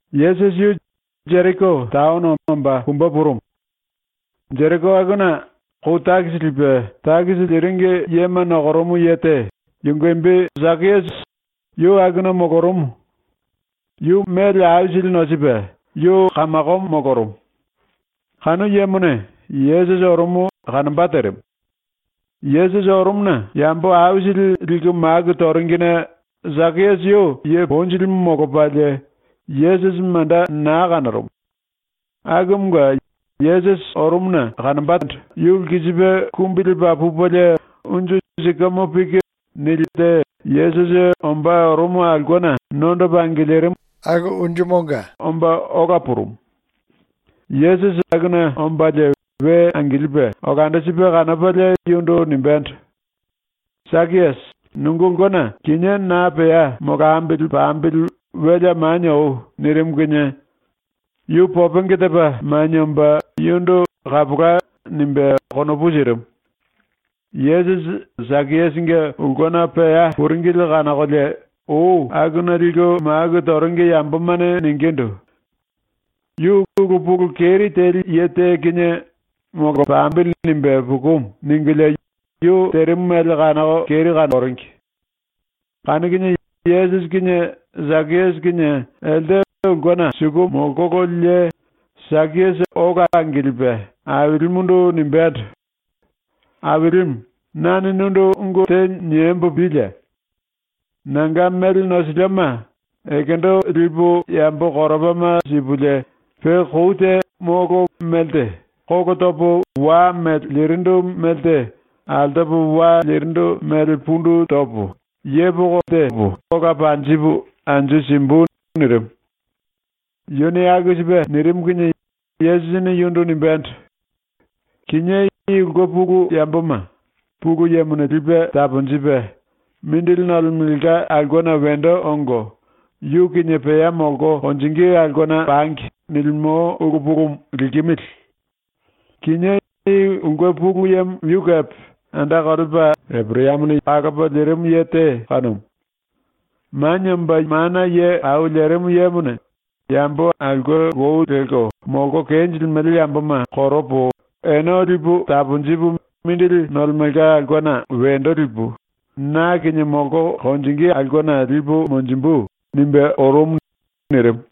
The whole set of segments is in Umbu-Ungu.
Yesusi yu Jeriko taono omba pumbe purumu. ⸤Jeriko akuna⸥ kou takisi lipe takisi liringi yema nokorumu ye te, yunge imbi Sakiasi, yu akuna molorumu. Yu mele aisili nosipe yu kamakomo molorumu. Kanu yemone Yesusi orumu kanomba terimu. Yesusi orumuna yambo aisili liku maku toringine Sakiasi yu ye ponjilimu molopalie Yesusi manda naa kanorumu. Akumunge Yesusi orumuna yu lkisipe kumbi lepa pupelie unju sikamo piki te Yesusi ombá orumu aulkena nondopa angilirimu unju tenga omba ola purumu. Yesusi akuna ombalie we angilipe olando sipe kanopalie yundu nimbendo: “Sakiasi, nunge ulkena kinié na pea molambili pambili welea manie oi.” nirimu kinie yu popenge tepa manie omba yundu “Kapola.” nimbe konopu sirimu. Yesusi Sakiasinge ulkena pea puringili kanokolie ou akuna liku maku toringi yambomane ningindu: “Yu ulu pulu keri teli ye te kinie ‘Molambili.’ nimbe pukumu.” ningulie yu terimu mele kanoko keri kanoringi. Kanu kinie Yesusi kinie Sakiasi kinie elte ulkena suku molkololie Sakiasi ola angilipe Ailimundu nimbendo: “Ailimu, nane nundu ungu te niembo pílie. Nanga mele nosilioma ekendo lipu yambo koropama sipulie, pe kou te molo melte kolo topo wa mele lirindu melte altopo wa lirindu mele pundu topo yepoko ola panjipu anju simbu.” nirimu. Yuni aku sipe nirimu kinie Yesusini yundu nimbendo: “Kinié i ulke pulu yamboma Pulu Yemone lipe taponjipe ‘mindili nolemelka aulkena wendo ongo, yu kinie pea molko konjingí aulkena pangi.’ nilimo ulu pulumu likimili. Kinié i ulke pulu yemo yu kepe anda kolepa Eporayamone kalopa lirimu ye te kanumu. “Manie Omba Mana Ye Au Lerimu Yemone ‘Yambo aulke lou lelko molko kenjilimele yamboma koropo, ene lipu taponjipu mindili nolemelka aulkena wendo lipu na kinie molko konjingí aulkena lipu monjimbu.’ nimbe orumu.” nirimu.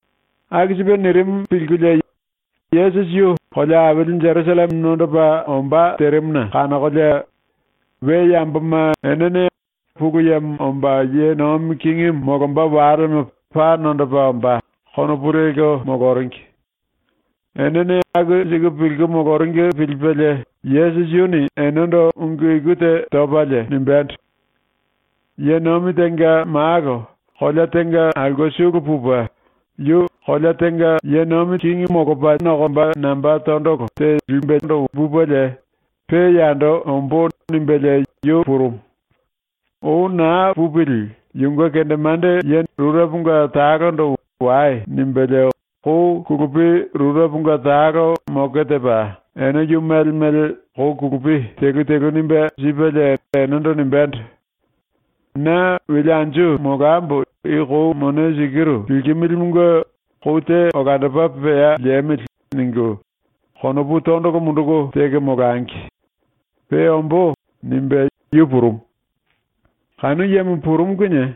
Aku sipe nirimu pilkulie Yesusi yu kolea aili Jerusalleme nondopa ombá terimuna kanokolie we yamboma enene ‘Pulu Yemo omba ye nomi kingimu molomba walemo paa nondopa ombá.’ konopu lelko moloringi. Enene aku siku pilku moloringi pilipelie ⸤Yesusi⸥ yuni enendo ungu iku te topalie nimbendo: “Ye nomi tenga malo kolea tenga aulke sulu pupe yu kingi molomba namba tondolo te lipupelie ‘Pe yando ombó.’ nimbelie yu purumu. Ou naa pupili yunge kendemande rureponga talondo “Wai.” nimbelie kou kulupi rureponga talo moke tepa ene yu mele mele kou kulupi telu telu nimbe sipelie enendo nimbendo: “Na wele anju molambo i kou mone sikiru likimilimunge ‘Kou te olandopa pea liemili.’ ningu konopu tondolo munduku teko molangi. Pe ombó.” nimbe yu purumu. Kanu yemo purumu kinie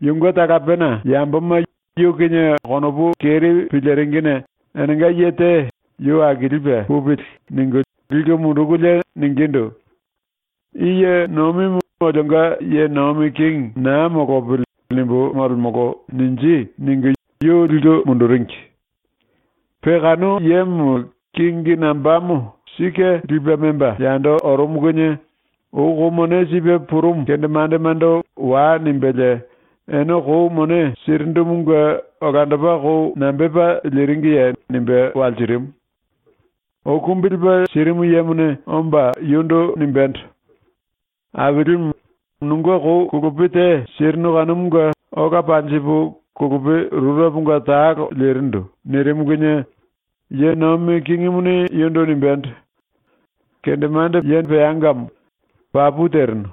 yunge talapena yamboma yu kinie konopu keri piliringine enenga ye te ‘Yu akilipe pupili.’ ningu liku mundukulie ningindu: “‘ “I ye nomimu olionga ye nomi kingi naa molopili.” nimbu molemolo.’ ninji.” ningu yu liku munduringi. Pe kanu yemo kingi nambamo sike lipe memba yando orumu kinie ou kou mone sipe purumu kendemandemando “Wai.” nimbelie “Ene kou mone sirindumunge olandopa kou nambepa liringiye?” nimbe walsirimu. Ou kumbi lepa sirimu yemone omba yundu nimbendo: “Ailimu, nunge kou kulupi te sirinu kanumunge ola panjipu kulupi rureponga talo lirindu.” nirimu kinie ye nomi kingimuni yundu nimbendo: “Kendemande peangamo. Papu terinu.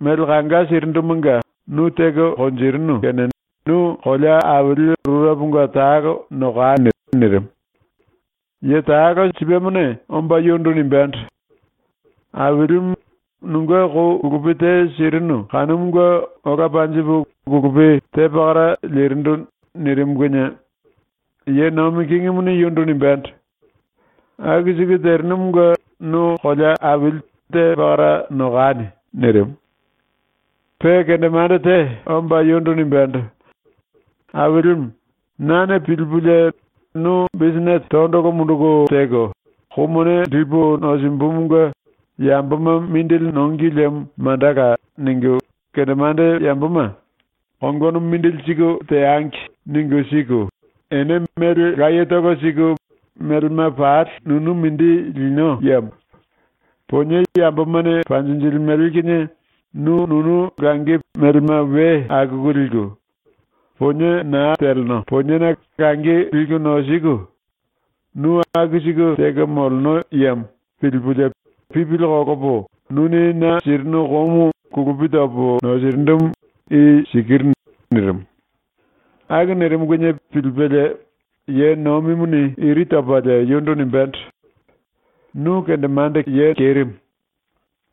Mele kanga sirindumunge nu teko konjirinu kene nu kolea aili rureponga talo nokani.” nirimu. Ye talo sipemone omba yundu nimbendo: “Ailimu, nunge kou kulupi te sirinu kanumunge ola panjipu kulupi te pakara lirindu.” nirimu kinie ye nomi kingimuni yundu nimbendo: “Aku siku terinumunge nu kolea aili te pakara nokani.” nirimu. Pe kendemande te omba yundu nimbendo: “Ailimu, nane pilipulie ‘Nu bisinete tondolo munduku teko, ‘Kou mone lipu nosimbumunge yamboma mindili nongi liemo mandala.’ ningu ⸤kendemande yamboma ‘Kongono mindili siku teangi.’ ningu siku, ene mele layetolo siku melema pali nunu mindi lino yemo;⸥ ponie yambomane panjinjilimele kinie nu nunu langi melema we akuku liku; ponie naa teleno poniena langi liku nosiku, nu aku siku teko moleno yemo.’ pilipulie pipili kolopo nuni na sirinu koumu kulupi topo nosirindumu i sikiru.” nirimu. Aku nirimu kinie pilipelie ye nomimuni iri topalie yundu nimbendo: “Nu kendemande kerimu.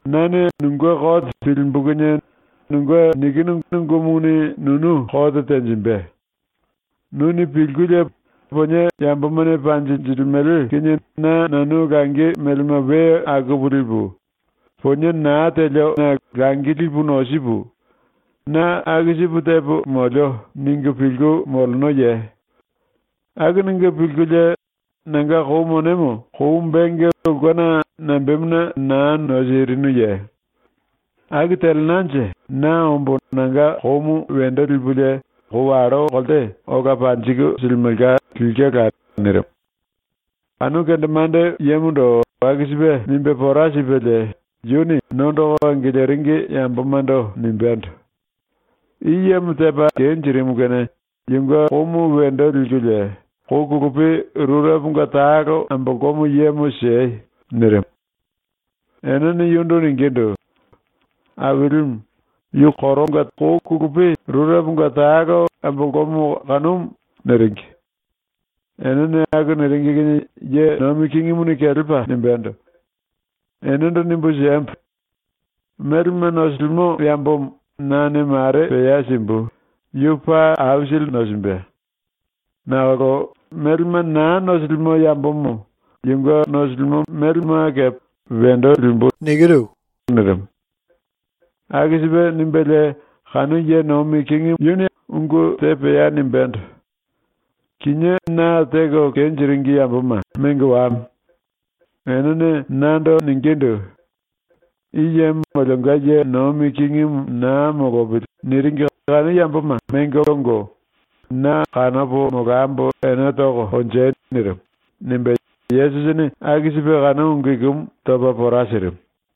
⸤Nane nunge kote pilimbu kinie⸥ nunge nikinu ungumuni nunu kote tenjimbe. Nuni pilkulie ‘Ponie yambomane panjinjilimele kinie na nanu langi melema we akupu lipu; ponie naa telio poniena langi lipu nosipu, na aku sipu tepo molio.’ ningu pilku molenoye? Aku ningu pilkulie nanga kou monemo kou benge ulkena nambemuna naa nosirinuye? Aku telenanje na ombo nanga koumu wendo lipulie kou wallo kolte ola panjiku silimelka lilkela.” nirimu. ⸤Kanu kendemande yemondo aku sipe nimbe pora sipelie⸥ yuni nondoko angiliringi yambomando nimbendo: “I yemo tepa kenjirimu kene yunge koumu wendo likulie kou kulupi rureponga talo ambolkomo yemo siei.” nirimu. Enene yundu ningindu: “Ailimu, yu kou kulupi rureponga talo ambolkomo kanumu.” niringi. Enene aku niringi kinie ye nomi kingimuni kelepa nimbendo: “Enendo nimbu siembo: Melema nosilimo yambomo nane mare pea simbu, yu paa aisili nosimbe. Nakolo melema naa nosilimo yambomo yu nosilimoma kepe wendo limbu.” nirimu. Aku sipe nimbelie kanu ye nomi kingimu yuni ungu te pea nimbendo: “Kinié na teko kenjiringi yamboma mengo wame. Enene nando ningindu: ‘I yemo olionga ye nomi kingimu naa molopili.’ niringi kanu yamboma mengo ongo na kanopo molambo ene toko konjei.” nirimu.” nimbe ⸤Yesusini aku sipe kanu ungu ikumu topa pora sirimu⸥.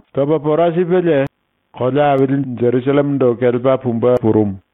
Topa pora sipelie kolea aili Jerusallemendo kelepa pumbe purumu.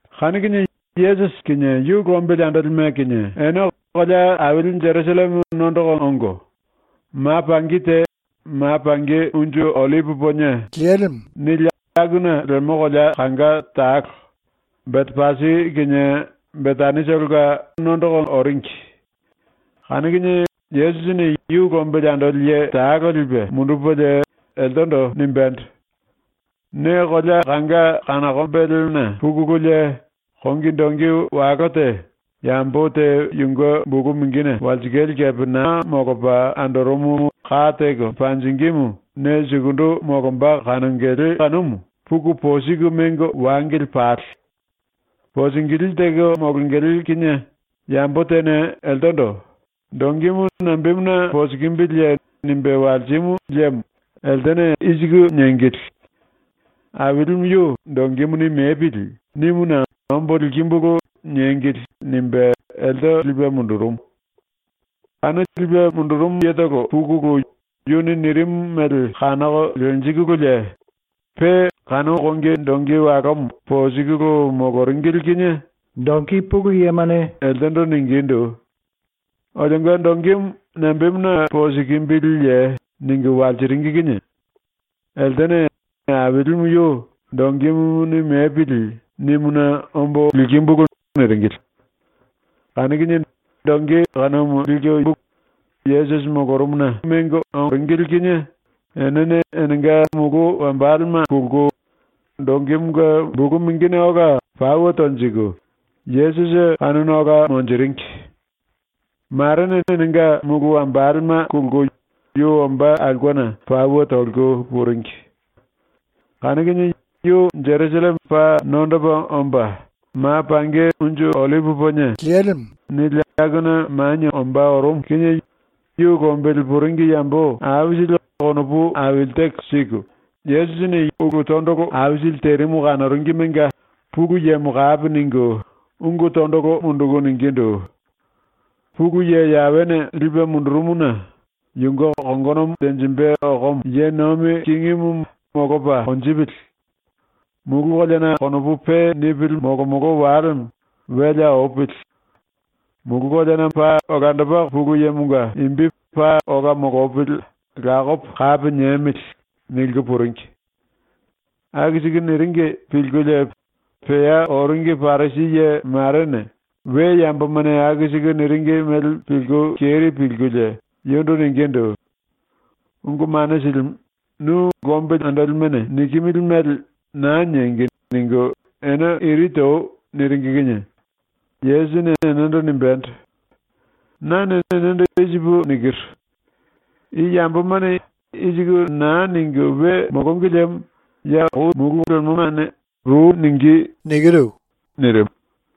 Kanu kinie Yesusi ⸤kinie yu lombili andolime kinie⸥ ene kolea aili Jerusalleme nondoko ongo, ma pangi te ‘Ma Pangi Unju Ollipi Ponie’ nili akuna lemo kolea kanga talo, Betepasi kinie Betanitolonga oringi. Kanu kinie Yesusini yu lombili andoli ye talo lipe mundupelie, eltendo nimbendo: “Ne kolea kanga kanokombelena pukululie kongi dongi walo te, yambo te yunge bulu mingine walsikale kepe naa molopa andorumumu ka teko panjingímu ne sukundu molomba kanongele kanumu puku posiku mengo wangili pale. Posingilí teko molongele kinie yambo tene eltendo “Dongimu nambemuna posikimbiliye?” nimbe walsimu liemo eltene i siku niengili: “Ailimu yu ‘Dongimuni mepili.’ nimuna ombo likimbulu.” niengili.” nimbe elte lipe mundurumu. Kanu lipe mundurumu yetolo pukulu yuni nirimu mele kanoko lenjikululie pe kanu kongi dongi walomo posikulu moloringili kinie dongi pulu yemane eltendo ningindu: “Olionga dongimu nambemuna posikimbiliye?” ningu walsiringi kinie eltene “Ailimu yu ‘Dongimuni mepili.’ nimuna ombo likimbulu.” niringili. Kanu kinie dongi kanumu likulu Yesusi molorumuna mengo ongololie enene enenga mulu wambalema kulku, dongimunge bulu mingine ola pauwe tonjiku Yesusi kanuna ola monjiringi. Marene enenga mulu wambalema kulku yu ombá aulkena pauwe toliku puringi. Kanu kinie yu Jerusalleme paa nondopa omba, ‘Ma Pangi Unju Ollipi Ponie’ nili akuna manie ombá orumu kinie yu lombili puringi yambo aisili konopu aili teko siku ⸤Yesusini⸥ ulu tondolo aisili terimu kanoringimenga Pulu Yemo kapi ningu ungu tondolo munduku ningindu: “Pulu Ye Yawene lipe mundurumuna yunge kongonomo tenjimbe okomo ye nomi kingimu molopa konjipili. Mulu koleana konopu pe nipili molomolo walemo welea opili. Mulu koleana molemo ⸤Pulu Yemonga⸥ imbi paa ola molopili lakopo kapi niemili.” niliku puringi. Aku siku niringi pilkulie pea oringi Parisi ye marene ⸤we yambomane aku siku niringi mele pilku keri pilkulie⸥ yundu ningindu: “Ungu Mane Silimu, nu lombili andolimene nikimili mele ‘Naa niengi.’ ningu ene iri toi.” niringi kinie Yesusini enendo nimbendo: “Nane enendo i sipu nikiru: I yambomane i siku naa ningu we molongi liemo ya kou lemomane ru ningí.” nirimu.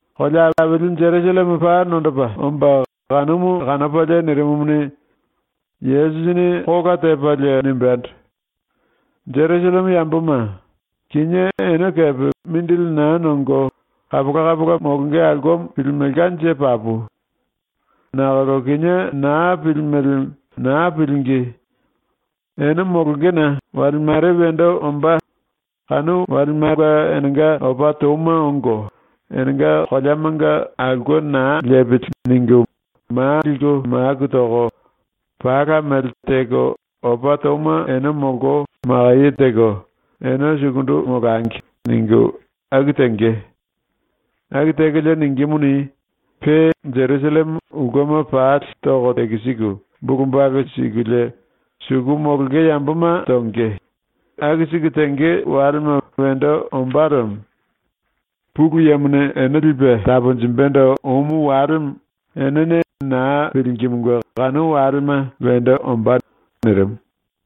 Kolea aili Jerusalleme paa nondopa omba kanumu kanopalie nirimumuni, Yesusini kola tepalie nimbendo: “⸤Jerusalleme yamboma,⸥ kinié ene kepe mindili naa nongo kapola kapola molonge aulkemo pilimelkanje papu. Nakolo kinié naa pilimele, naa pilingí. Ene molongena wale mare wendo ombá, kanu walemanga enenga opa touma ongo ‘Enenga koleamonga aulke naa lepili.’ ningu ma liku maku toko, pala mele teko opa touma ene molko makaye teko ‘Ene sukundu molangi.’ ningu aku tenge. Aku tekolie ningímuni, pe Jerusalleme ulkema pali toko tekisiku bulu balu sikulie suku molonge yamboma tonge, aku siku tenge walema wendo ombá lemo. Pulu Yemone ⸤ene lipe taponjimbendo⸥ omu walemo enene naa pilingimunge kanu walema wendo ombá.” nirimu.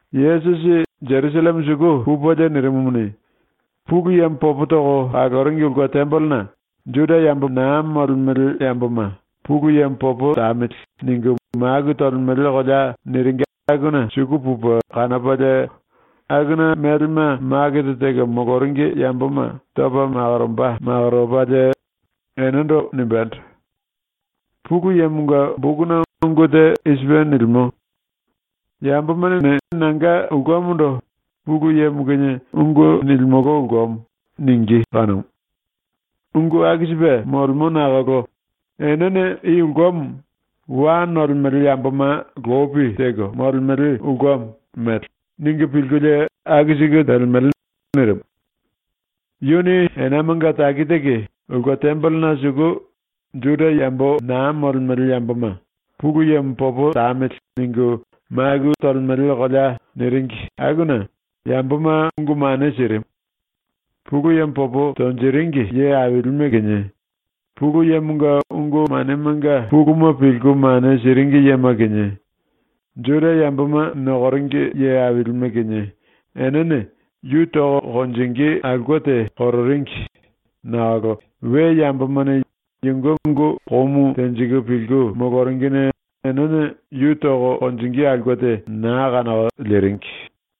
Yesusi Jerusalleme suku pupelie nirimumuni, Pulu Yemo popo toko kaloringi ulke tembelena ⸤“Juda yambo naa molemele yamboma ‘Pulu Yemo popo tamili.’ ningu maku tolemele kolea” niringi akuna⸥ suku pupe kanopalie akuna melema makete teko moloringi yamboma topa makoromba makoropalie enendo nimbendo: “Pulu Yemonga bokuna ungu te i sipe nilimo: ‘Yambomane nanga ulkemondo “Pulu Yemo kinie ungu nilimolo ulkemo.” ningí.’ kanumu. Ungu aku sipe molemo nakolo enene i ulkemo ‘wa nolemele yamboma lopi teko molemele ulkemo’ mele ningu pilkulie aku siku telemele.” nirimu. Yuni enamanga taki taki ulke tembelena suku ⸤“Juda yambo naa molemele yamboma ‘Pulu Yemo popo tamili.’ ningu maku tolemele kolea” niringi akuna⸥ yamboma ungu mane sirimu. Pulu Yemo popo tonjiringi ye ailime kinie, Pulu Yemonga ungu manemanga puluma pilku mane siringi yema kinie, Juda yamboma nokoringi ye ailime kinie, enene yu toko konjingí aulke te kororingi nakolo we yambomane yunge ungu komu tenjiku pilku moloringine enene yu toko konjingí aulke te naa kanoko liringi.